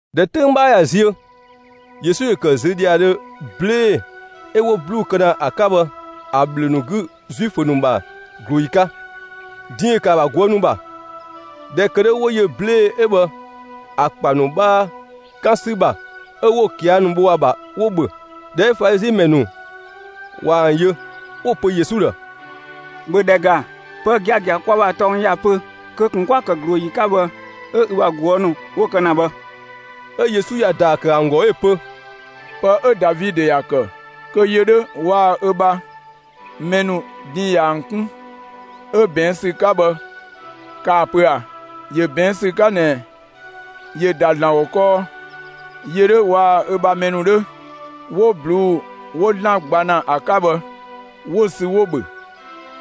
꞊Dhɛ 'töng 'bhaa ꞊ya ziö, Yesu ‑yö ‑kë ziö ‑dhiadhö 'blee‑ 'ö 'wo 'bluu‑ ‑pë ‑kë ‑a 'ka ‑a ‑bhlö ‑nu 'gü Zuifö ‑nu ‑bha ꞊glooyi 'ka. Din ‑yö ‑kë ‑a ‑bha ꞊guë' ‑nu ‑bha. ꞊Dhɛ ‑kë 'dhö 'wo yö 'blee‑ 'ö bhë ‑a ‑kpa ‑nu 'bhaa 'kan ‑sü ‑bha 'ö 'wo‑ ꞊kia' ‑nu bho ‑a ‑bha, 'wo‑ ‑bhö. ꞊Dhɛ 'ö Falizi ‑mɛ ‑nu ꞊wa ‑an yö, 'wo‑ pö Yesu ‑dhë: «‑Bhö ‑dhɛ ‑ga, pë giagia 'ö kwa ‑bha tɔng ‑ya pö kö ꞊kun 'kwa‑ ‑kë ꞊glooyi 'ka bhë 'ö ü bha ꞊guë' ‑nu 'wo‑ kë ‑na bhë!» 'Ö Yesu ‑ya ‑daa ‑kë ‑an ‑gɔ 'ö‑ pö: «Pë 'ö Davidö ‑ya ‑kë kö yö 'dhö waa‑ ö ‑bha mɛ ‑nu, din ꞊ya ‑an 'kun, 'ö ꞊bɛɛn' ‑sü 'ka bhë kaa‑ pö ꞊a? ‑Yö ꞊bɛɛn' ‑sü 'ka ꞊nɛ ‑yö ‑da ‑Zlan ‑gɔ kɔɔ; yö 'dhö waa‑ ö ‑bha mɛ ‑nu 'dhö, 'wo ꞊bluu'‑ 'wo ‑Zlan gba ‑na ‑a 'ka bhë 'wo‑ sü 'wo‑ ‑bhö,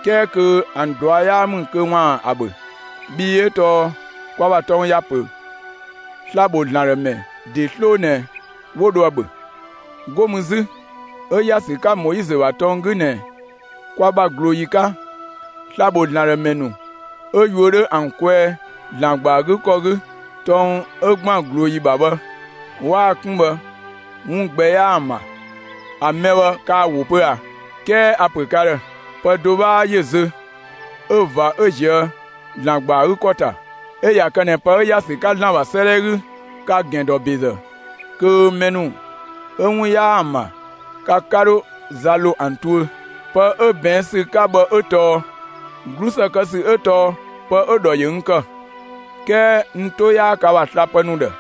'kɛɛ kö ‑an ꞊dua' 'yaa ‑mü kö ‑waan ‑a ‑bhö. Bhii 'ö tɔɔ kwa ‑bha tɔng ‑ya ‑pö sla‑ ‑bho ‑Zlan ‑dhë ‑mɛ ‑de 'sloo ꞊nɛ 'wo dho ‑a ‑bhö. 'Go mü 'zü 'ö ‑ya ‑sü 'ka Moizö ‑bha tɔng 'gü ꞊nɛ, kwa ‑bha ꞊glooyi 'ka, sla‑ ‑bho ‑Zlan ‑dhë ‑mɛ ‑nu 'ö yuö 'dhö ‑an kwɛɛ, ‑Zlan ‑gba ‑a 'gü ‑kɔ 'gü, tɔng 'ö ‑gban ꞊glooyi ‑bha bhë 'waa‑ 'kun bhë 'wun gbɛ 'yaa ‑an ‑bha. ‑A mɛ bhë 'kaa‑ ‑wo pö ꞊a? 'Kɛɛ a‑ ‑pö ka ‑dhë: Pë do 'bhaa ‑yö zö 'ö ꞊va 'ö ꞊zië' ‑Zlan ‑gba ‑a 'gü ‑kɔ ‑ta. 'Ö ꞊ya kë ꞊nɛ pë 'ö ‑ya ‑sü 'ka ‑Zlan ‑bha 'sëëdhɛ 'gü, ka‑ ‑gɛn dɔ ‑bezë kö mɛ ‑nu 'ö 'wun 'yaa ‑an ‑bha, ka 'ka 'dho za ‑lo ‑an tuö. Pë 'ö ꞊bɛɛn' ‑sü 'ka bhë 'ö tɔɔ: 'Glusë kë ‑sü 'ö tɔɔ pë 'ö‑ ‑dhɔ ‑yö n ‑kë, 'kɛɛ n 'to 'yaa ka ‑bha slapë ‑nu ‑dhë.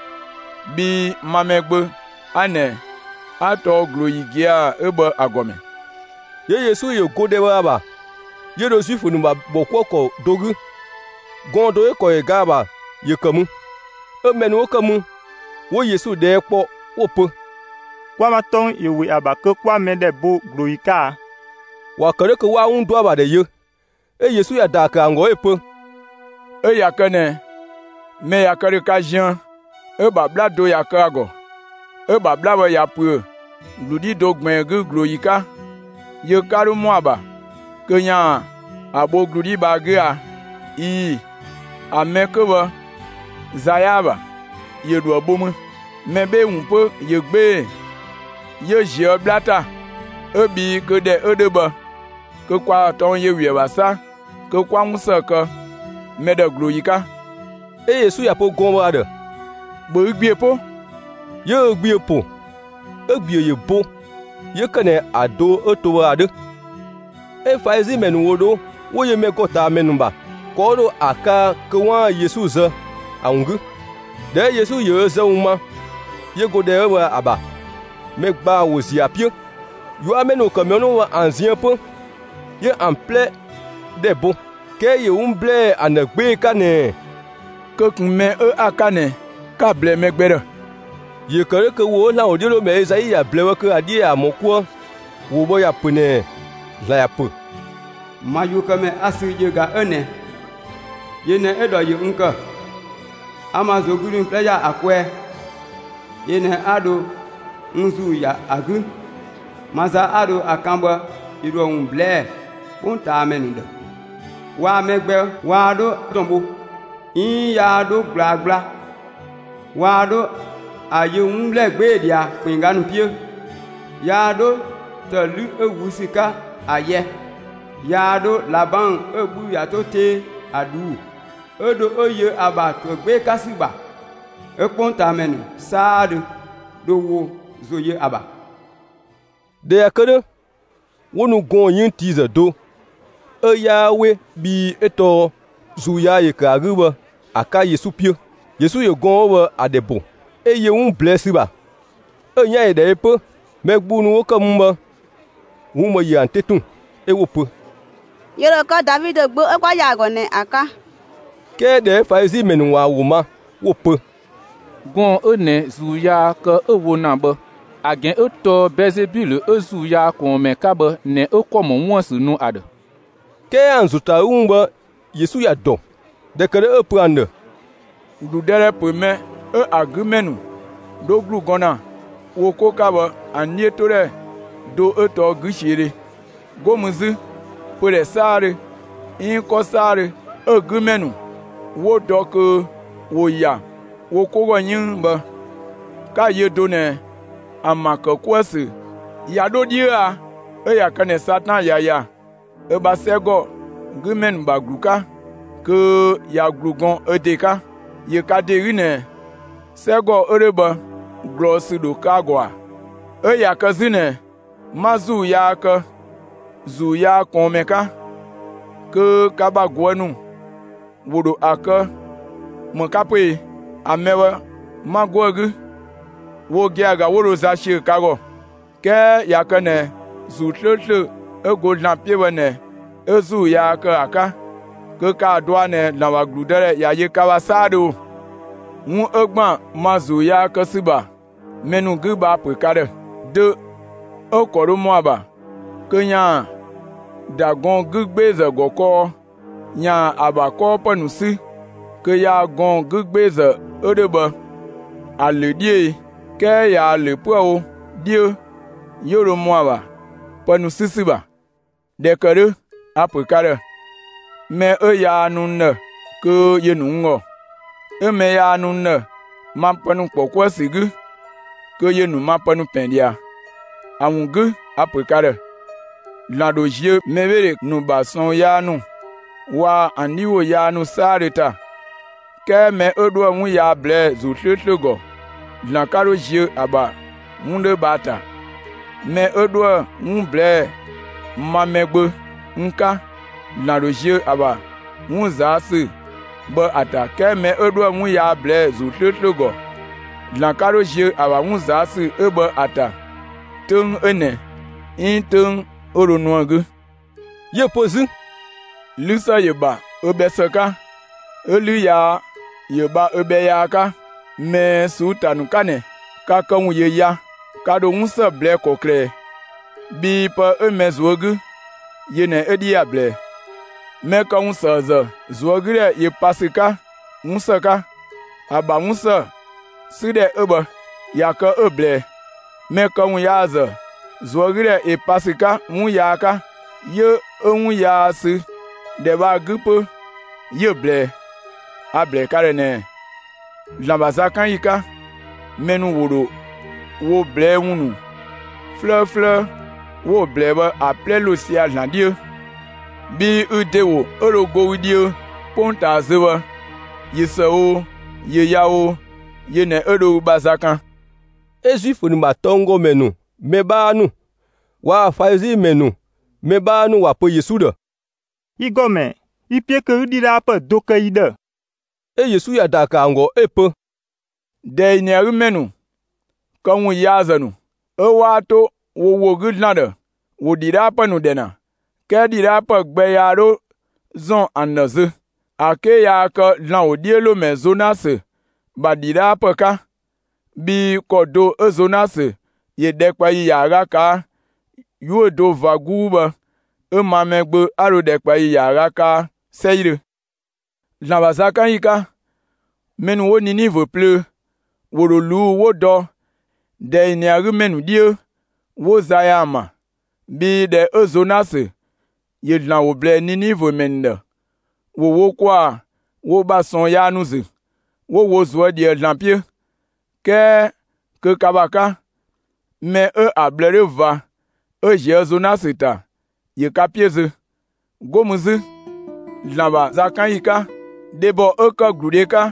Bhii ma Mɛgbö 'a ꞊nɛ, 'a tɔɔ ꞊glooyi gia‑ 'ö bhë ‑a ‑gɔmɛ.» 'Yö Yesu ‑yö go ‑dhɛ bhë ‑a ‑bha, 'yö dho Zuifö ‑nu ‑bha ‑bhɔkuëkɔ do 'gü. Gɔɔn‑ do 'ö‑ ‑kɔ ‑yö ga ‑a ‑bha ‑yö ‑kë mü. 'Ö mɛ ‑nu 'wo ‑kë mü, 'wo Yesu ꞊dhɛɛ' kpɔ 'wo‑ pö: «Kwa ‑bha tɔng ‑yö ‑we ‑a ‑bha kö 'kwa mɛ ‑dhɛ bo ꞊glooyi 'ka a?» ‑Wa ‑kë 'dhö kö 'waan‑ 'wun ‑dɔ ‑a ‑bha ‑dhɛ yö. 'Ö Yesu ‑ya ‑daa ‑kë ‑an ‑gɔ 'ö‑ pö: «'Ö ꞊ya kë ꞊nɛ, mɛ ꞊ya kë ‑dhö ka ziën, 'ö 'bhla do ꞊ya kë ‑a ‑gɔ, 'ö‑ ‑bha 'bhla bhë ꞊ya ‑püö ‑glu 'dhi ꞊gbiin do 'gü ꞊glooyi 'ka, yö 'ka 'dho ‑mɔ ‑a ‑bha kö ‑yaan ‑a bho ‑glu 'dhi bhë ‑a 'gü a? ꞊Ii‑, ‑a mɛ 'kö bhë za 'yaa‑ ‑bha, ‑yö ‑dho ‑a bho mü. Mɛ 'bhee‑ ‑wun 'pö ‑yö 'gbee‑ 'yö ꞊zië' 'bhla ‑ta! 'Ö bhii, kö ‑dhɛ 'ö 'dhö bhë, kö kwa ‑bha tɔng ‑yö ‑we ‑a ‑bha 'sa kö 'kwa 'wun ‑së kë mɛ ‑dhë ꞊glooyi 'ka.» 'Ö Yesu ‑ya pö gɔɔn‑ bhë ‑a ‑dhë: «‑Bhö ü ‑gbiö 'po!» 'Yö ö ‑gbiö ‑po, 'ö‑ ‑gbiö ‑yö bo 'yö ‑kë ꞊nɛ ‑a do 'ö to bhë ‑a 'dhö. 'Ö Falizi ‑mɛ ‑nu ‑wo dho 'wo yö mɛ ‑gɔ ꞊taa ‑mɛ ‑nu ‑bha, ‑kɔ 'wo dho ‑a kaa kö 'waan‑ Yesu zë ‑a ‑wun 'gü. ꞊Dhɛ 'ö Yesu ‑yö ö zë ‑wun ma, 'yö go ‑dhɛ 'ö bhë ‑a ‑bha. Mɛ ‑gbaa ‑wo ‑ziö ‑a 'piö. 'Yuamɛ ‑nu ‑wo ‑kë mɛ ‑nu 'wo bhë ‑an ziën 'pö, 'yö ‑an 'plɛ ‑dhɛ bo. 'Kɛɛ ‑yö 'wun ‑blɛɛ ‑an ‑dhë 'gbee‑ 'ka ꞊nɛɛ: «Kö ꞊kun mɛ 'ö 'a‑ 'ka ꞊nɛ, 'ka‑ ꞊blɛɛ mɛ gbɛ ‑dhë!» ‑Yö ‑kë 'dhö kö ‑wo 'ö ‑Zlan ‑wodhiölomɛ Ezai ‑ya ꞊blɛɛ bhë ‑a 'dhiö ‑yaan ‑mɔ 'kuë. ‑Wo bhë ‑ya ‑pö ꞊nɛɛ: ‑Zlan ‑ya ‑pö: Ma yuökëmɛ 'a‑ sü, yö ꞊ga 'ö ꞊nɛ! Yö ꞊nɛ 'ö‑ ‑dhɔ ‑yö n ‑kë, 'a n ‑ma ꞊zuögludhi ‑wun 'plɛ ‑ya ‑a kwɛɛ, yö ꞊nɛ 'a dho n ‑Zuu ‑ya ‑a 'gü; ma za 'a dho ‑a kan bhë ‑yö ‑dhoë ‑wun ꞊blɛɛ'‑ 'kpongtaamɛ ‑nu ‑dhë. Waa‑ mɛ gbɛ waa 'dho ‑dɔn bho, 'iin yaa 'dho ꞊gblaa gbla; waa 'dho ‑a yö 'wun ‑blɛɛ 'gbee‑ ꞊dhia ‑kpinngga ‑nu 'piö. Yaa 'dho ‑të 'lü 'ö ꞊wüü' ‑sü 'ka ‑a yɛ; yaa 'dho ꞊labang 'ö‑ 'bhü ꞊ya 'to 'tee ‑a ꞊dhuu'‑, 'ö dho 'ö yö ‑a ‑bha ‑to ‑a 'gbee‑ 'ka ‑sü 'wun kpengdhö 'gü ‑yi ‑bha. 'Ö 'kpongtaamɛ ‑nu 'saadhö dho wo ‑zo yö ‑a ‑bha. ꞊Dhɛ ꞊ya kë 'dhö, 'wo nu gɔɔn‑ 'yënngtiizë do 'ö 'yaa 'we bhii 'ö tɔɔ ‑zuu yaa ‑yö ‑kë ‑a 'gü bhë ‑a 'ka Yesu 'piö. Yesu ‑yö gɔɔn‑ 'ö bhë ‑a ‑dhɛ ‑bo, 'ö yö 'wun ꞊blɛɛ' ‑sü ‑bha, 'ö‑ 'yan ‑yö ‑dhɛ yö 'pö. Mɛ gbung ‑nu 'wo ‑kë mü bhë, 'wun bhë ‑yö ‑an 'te tun, 'ö 'wo‑ pö: «‑Yö ‑dho kë Davidö gbö ('ö kwa ‑ya ‑a ‑gɔ ꞊nɛ ‑a) 'ka.» 'Kɛɛ ꞊dhɛ 'ö Falizi ‑mɛ ‑nu ꞊wa ‑an ‑wo ma, 'wo‑ pö: «Gɔɔn‑ 'ö ꞊nɛ ‑zuu yaa kë 'ö‑ wo ‑na bhë ‑a ‑gɛn 'ö tɔɔ Bɛɛzebilö 'ö ‑zuu yaa ꞊kɔɔnmɛ 'ka bhë ꞊nɛ 'ö ‑kɔ ‑mɔ 'wun ‑bha ‑sü nu ‑a ‑dhë.» 'Kɛɛ ‑an ‑zo ‑ta ‑a 'gü ‑wun bhë Yesu ‑ya ‑dɔ. ꞊Dhɛ ‑kë 'dhö 'ö‑ pö ‑an ‑dhë: «‑Gludëdhɛ ‑pö mɛ 'ö ‑a 'gü ‑mɛ ‑nu 'dho ‑glu gɔn ‑na wo 'ko 'ka bhë ‑an 'dhiötodhɛ do 'ö tɔɔ 'güsiödhe. 'Go mü 'zü, pödhɛ 'saadhö, 'iin 'kɔ 'saadhö 'ö‑ 'gü ‑mɛ ‑nu 'wo dɔ kö ‑wo ‑ya wo 'ko ‑gɔ 'yënng bhë, 'ka‑ yö do ꞊nɛ ‑an ‑bha ‑kë 'kuë‑ ‑sü ꞊ya 'dho 'dhiö a? 'Ö ꞊ya kë ꞊nɛ Satan ꞊ya ‑ya ö ‑bha 'sɛgümɛ ‑nu ‑bha ‑glu 'ka, kö ꞊ya ‑glu gɔn ö ‑de 'ka. ‑Yö ka ‑de 'gü ꞊nɛ, 'sɛgɔ 'ö 'dhö bhë ꞊glɔɔsü ‑dho kë ‑a ‑gɔ ‑a? 'Ö ꞊ya kë 'zü ꞊nɛ 'ma ‑zuu yaa kë ‑zuu yaa ꞊kɔɔnmɛ 'ka, kö ka ‑bha ꞊guë' ‑nu ‑wo ‑dho ‑a kë ‑më 'ka 'pö e? ‑A mɛ bhë 'ma 'go ‑a 'gü, wo gia‑ ‑ga 'wo dho za ꞊siö ka ‑gɔ. 'Kɛɛ ꞊ya kë ꞊nɛ ‑Zuu 'slööslö 'ö go ‑Zlan 'piö bhë ꞊nɛ 'a ‑zuu yaa ‑kë ‑a 'ka, kö ‑kaa dɔa ꞊nɛ ‑Zlan ‑bha ‑gludëdhɛ ꞊ya yö ka ‑bha 'saadhö ‑o! ('Wun 'ö ‑gban ma ‑zuu yaa kë ‑sü ‑bha mɛ ‑nu 'gü bhë a‑ ‑pö ka ‑dhë:) Dö 'ö‑ ‑kɔ dho ‑mɔ ‑a ‑bha kö ‑yaan ‑da gɔɔn‑ 'gü 'gbeezë ‑gɔ kɔɔ ‑yaan ‑a ‑bha 'kɔɔpë ‑nu 'sü kö yaa gɔɔn‑ 'gü 'gbeezë 'ö 'dhö bhë ‑a ‑lö 'dhiö e? 'Kɛɛ ꞊yaa‑ ‑lö 'püë‑ wo 'dhiö, 'yö dho ‑mɔ ‑a ‑bha pë ‑nu 'sü ‑sü ‑bha. ꞊Dhɛ ‑kë 'dhö a‑ ‑pö 'ka ‑dhë: Mɛ 'ö yaa nu n ‑dhë kö ‑yö ‑nu n ‑gɔ. 'Ö mɛ yaa nu n ‑dhë, ma pë ‑nu ‑kpɔ 'kuë‑ ‑sü 'gü, kö ‑yö ‑nu ma pë ‑pɛn ꞊dhia. ‑A ‑wun 'gü a‑ ‑pö ka ‑dhë: ‑Zlan ‑dho ziö mɛbheedhe ‑nu ‑bha ꞊sɔɔn yaa ‑nu waa‑ ‑an 'dhi ‑wo yaa ‑nu 'saadhö ‑ta. 'Kɛɛ mɛ 'ö 'dhoë‑ 'wun yaa ꞊blɛɛ'‑ ‑Zuu 'slööslö ‑gɔ, ‑Zlan 'ka 'dho ziö ‑a ‑bha 'wun 'dhö bhë ‑a ‑ta. Mɛ 'ö 'dhoë‑ 'wun ꞊blɛɛ'‑ ma Mɛgbö n 'ka, ‑Zlan ‑dho ziö ‑a ‑bha 'wun ꞊zaa' ‑sü bhë ‑a ‑ta, 'kɛɛ mɛ 'ö 'dhoë‑ 'wun yaa ꞊blɛɛ'‑ ‑Zuu 'slööslö ‑gɔ, ‑Zlan 'ka 'dho ziö ‑a ‑bha 'wun ꞊zaa' ‑sü 'ö bhë ‑a ‑ta 'töng 'ö ꞊nɛ 'iin 'töng 'ö dho nu ‑an 'gü.» 'Yö‑ pö 'zü: «'Lü ‑së ‑yö ‑bha ö bhɛ ‑së 'ka, 'ö 'lü yaa ‑yö bha ö bhɛ yaa 'ka. ꞊Mɛɛ ꞊suu'‑ ‑ta ‑nu 'ka ꞊nɛ, ka këwun ‑yö ya, ka ‑dho 'wun ‑së ꞊blɛɛ'‑ ‑kɔklë ꞊ɛ? Bhii pë 'ö mɛ ꞊zuö' 'gü, yö ꞊nɛ 'ö 'dhi ‑ya ꞊blɛɛ. Mɛ këwunsëëzë ꞊zuögüdhɛ ‑yö pa ‑sü 'ka 'wun ‑së 'ka. ‑A ‑bha 'wun ‑së 'sü ‑dhɛ 'ö bhë, ꞊ya kë 'ö‑ ꞊blɛɛ. Mɛ këwunyaazë ꞊zuögüdhɛ ‑yö pa ‑sü 'ka 'wun yaa 'ka. 'Yö 'ö 'wun yaa ‑sü ‑dhɛ bhë ‑a 'gü 'pö 'yö‑ ꞊blɛɛ. A‑ ‑blɛɛ ka ‑dhë ꞊nɛɛ: ‑Zlan ‑bha zakanyi 'ka, mɛ ‑nu ‑wo ‑dho wo ꞊blɛɛ'‑ ‑wun ‑nu 'flëëflëë 'wo‑ ꞊blɛɛ bhë ‑a 'plɛ ‑lo sia‑ ‑Zlan 'dhiö. Bhii ü ‑de ‑wo 'ö dho go ü dhiö 'kpongtaa zö bhë, ꞊yö ‑së o, ꞊yö yaa o, yö ꞊nɛ 'ö dho ü ‑bha za kan.» 'Ö Zuifö ‑nu ‑bha tɔnggɔmɛ ‑nu mɛ 'bhaa ‑nu waa‑ Falizi ‑mɛ ‑nu mɛ 'bhaa ‑nu ‑wa pö Yesu ‑dhë: «Yi ‑Gɔmɛ, yi‑ 'piö kö 'ü ‑dhidhaapë do kë yi ‑dhë.» 'Ö Yesu ‑ya ‑daa ‑kë ‑an ‑gɔ 'ö‑ pö: «꞊Dɛɛ ‑yi ꞊nɛ ‑a 'gü ‑mɛ ‑nu këwunyaazë ‑nu, 'ö 'waa 'to wo ‑wo 'gü ‑Zlan ‑dhë, ‑wo ‑dhidhaapë ‑dhɛ ‑na, 'kɛɛ ‑dhidhaapë gbɛ yaa 'dho ‑zɔn ‑an ‑dhë zö, ‑a 'ke yaa kë ‑Zlan ‑wodhiölomɛ Zonasö ‑bha ‑dhidhaapë 'ka. Bhii ‑kɔ do 'ö Zonasö ‑yö ‑dhɛkpaɔyi ‑yaaga ꞊kaa' 'yuö‑ do ꞊va 'guu bhë, 'ö ma Mɛgbö 'a dho ‑dhɛkpaɔyi ‑yaaga kaa 'sɛidhö. ‑Zlan ‑bha zakanyi 'ka, mɛ ‑nu 'wo Ninivö plöö, ‑wo ‑dho ꞊luu' 'wo dɔ ꞊dɛɛ ꞊nɛ ‑a 'gü mɛ ‑nu 'dhiö, 'wo za ‑ya ‑an ‑bha; bhii ꞊dhɛ 'ö Zonasö ‑yö ‑Zlan ‑wo ‑blɛɛ Ninivö ‑mɛ ‑nu ‑dhë, ‑wo wo ‑kwaa wo ‑bha ꞊sɔɔn yaa ‑nu ‑zü, 'wo wo ꞊zuö' ꞊dhië ‑Zlan 'piö. 'Kɛɛ kö ka ‑bha 'ka, mɛ 'ö 'a ꞊bhlë 'dhö ꞊va 'ö ꞊zië' Zonasö ‑ta, ‑yö ka 'piö zö. 'Go mü 'zü ‑Zlan ‑bha zakanyi 'ka, dhebɔ 'ö ‑kë ‑gludë 'ka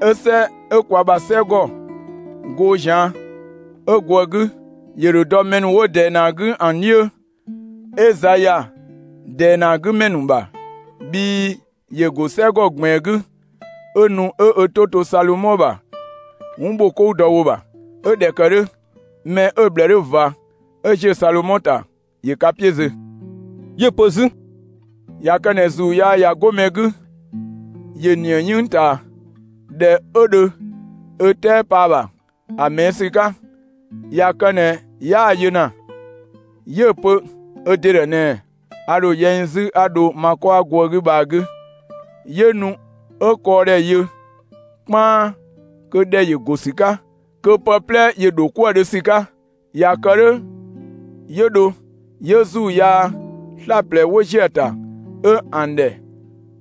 'ö 'sɛ 'ö kwa ‑bha 'sɛgɔ goo ꞊zian' 'ö go ‑a 'gü, ‑yö ‑dho dɔ mɛ ‑nu 'wo ꞊dɛɛ ꞊nɛ ‑a 'gü ‑an 'dhiö, 'ö za ‑ya ꞊dɛɛ ꞊nɛ ‑a 'gü ‑mɛ ‑nu ‑bha. Bhii ‑yö ‑go 'sɛgɔ ꞊gbiin 'gü, 'ö nu 'ö ö 'to to Salomɔ ‑bha 'wun ‑bho 'kou dɔ ‑wo ‑bha. 'Ö ꞊dhɛ ‑kë 'dhö, mɛ 'ö‑ ꞊bhlë 'dhö ꞊va 'ö ꞊zië' Salomɔ ‑ta, ‑yö ka 'piö zö.» 'Yö‑ pö 'zü: «꞊Ya kë ꞊nɛ ‑zuu yaa ꞊ya 'go mɛ 'gü, ‑yö ‑nië 'yënng ꞊taa, ‑dhɛ 'ö dho ö 'tɛɛ pa ‑a ‑bha ‑a ꞊mɛɛ' ‑sü 'ka. ꞊Ya kë ꞊nɛ 'yaa‑ yö ‑na, 'yö‑ pö ö ‑de ‑dhë ꞊nɛɛ: ‹A ‑dho yɛ n 'zü, 'a dho ma 'kɔ 'a go ‑a 'gü bhë ‑a 'gü.› 'Yö nu 'ö kɔɔdhɛ yö 'kpaan, kö ‑dhɛ ‑yö ‑go ‑sü 'ka, 'kö pë 'plɛ ‑yö ‑dho 'kuë‑ dhö ‑sü 'ka. ꞊Ya kë 'dhö 'yö dho, 'yö ‑zuu yaa 'slaplɛ 'wo ‑ziö ‑a ‑ta, 'ö ‑an ‑dhɛ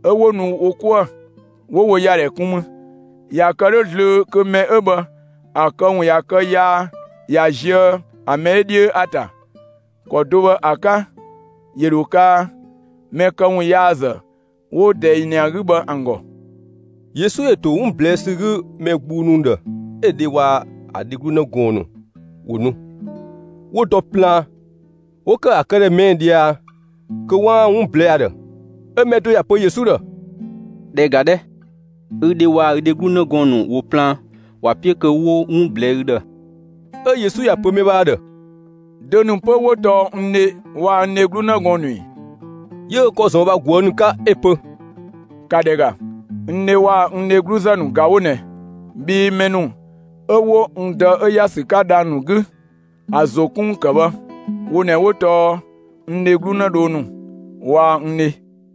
'ö 'wo nu wo 'kuë, 'wo wo ‑ya ‑dhɛ kun mü. ꞊Ya kë 'dhö zlöö kö mɛ 'ö bhë ‑a këwun ꞊ya kë yaa ꞊ya zië ‑a mɛ 'ö 'dhiö ‑a ‑ta. ‑Kɔ do bhë ‑a 'ka 'yö dho kaa, mɛ këwunyaazë 'wo ꞊dɛɛ ‑yi ꞊nɛ ‑a 'gü bhë ‑an ‑gɔ.» Yesu ‑yö ‑to 'wun ꞊blɛɛ'‑ ‑sü 'gü mɛ gbung ‑nu ‑dhë 'ö‑ dhe waa‑ ‑a dheglu 'në gɔɔn‑ ‑nu ‑wo ‑nu, 'wo dɔ plaan, 'wo ‑kë ‑a këdhɛ ꞊mɛɛ' ꞊dhia kö 'waan‑ 'wun ꞊blɛɛ'‑ ‑a ‑dhë. 'Ö mɛ do ‑ya pö Yesu ‑dhë: «‑Dhɛ ‑ga 'dhɛ, ü dhe waa‑ ü dheglu 'në gɔɔn‑ ‑nu ‑wo plaan, ‑wa 'piö kö 'wo 'wun ꞊blɛɛ'‑ ü ‑dhë.» 'Ö Yesu ‑ya pö mɛ bhë ‑a ‑dhë: «Dö ‑nu 'pö 'wo tɔɔ n dhe waa‑ n dheglu 'në gɔɔn‑ ‑nu ‑i?» 'Yö ö ‑kɔ ‑zɔn ö bha ꞊guë' ‑nu 'ka 'ö‑ pö: «‑Ka ‑dhɛ ‑ga, n dhe waa‑ n dhegluzë ‑nu ꞊ga 'wo ꞊nɛ. Bhii mɛ ‑nu 'ö 'wo n Dë 'ö ‑ya ‑sü 'ka dhang‑ ‑nu 'gü ‑a ‑zo 'kun ‑wun kë bhë, wo ꞊nɛ 'wo tɔɔ n dheglu 'në gɔɔn‑ ‑nu, n dheglu 'në dhoo ‑nu waa‑ n dhe.»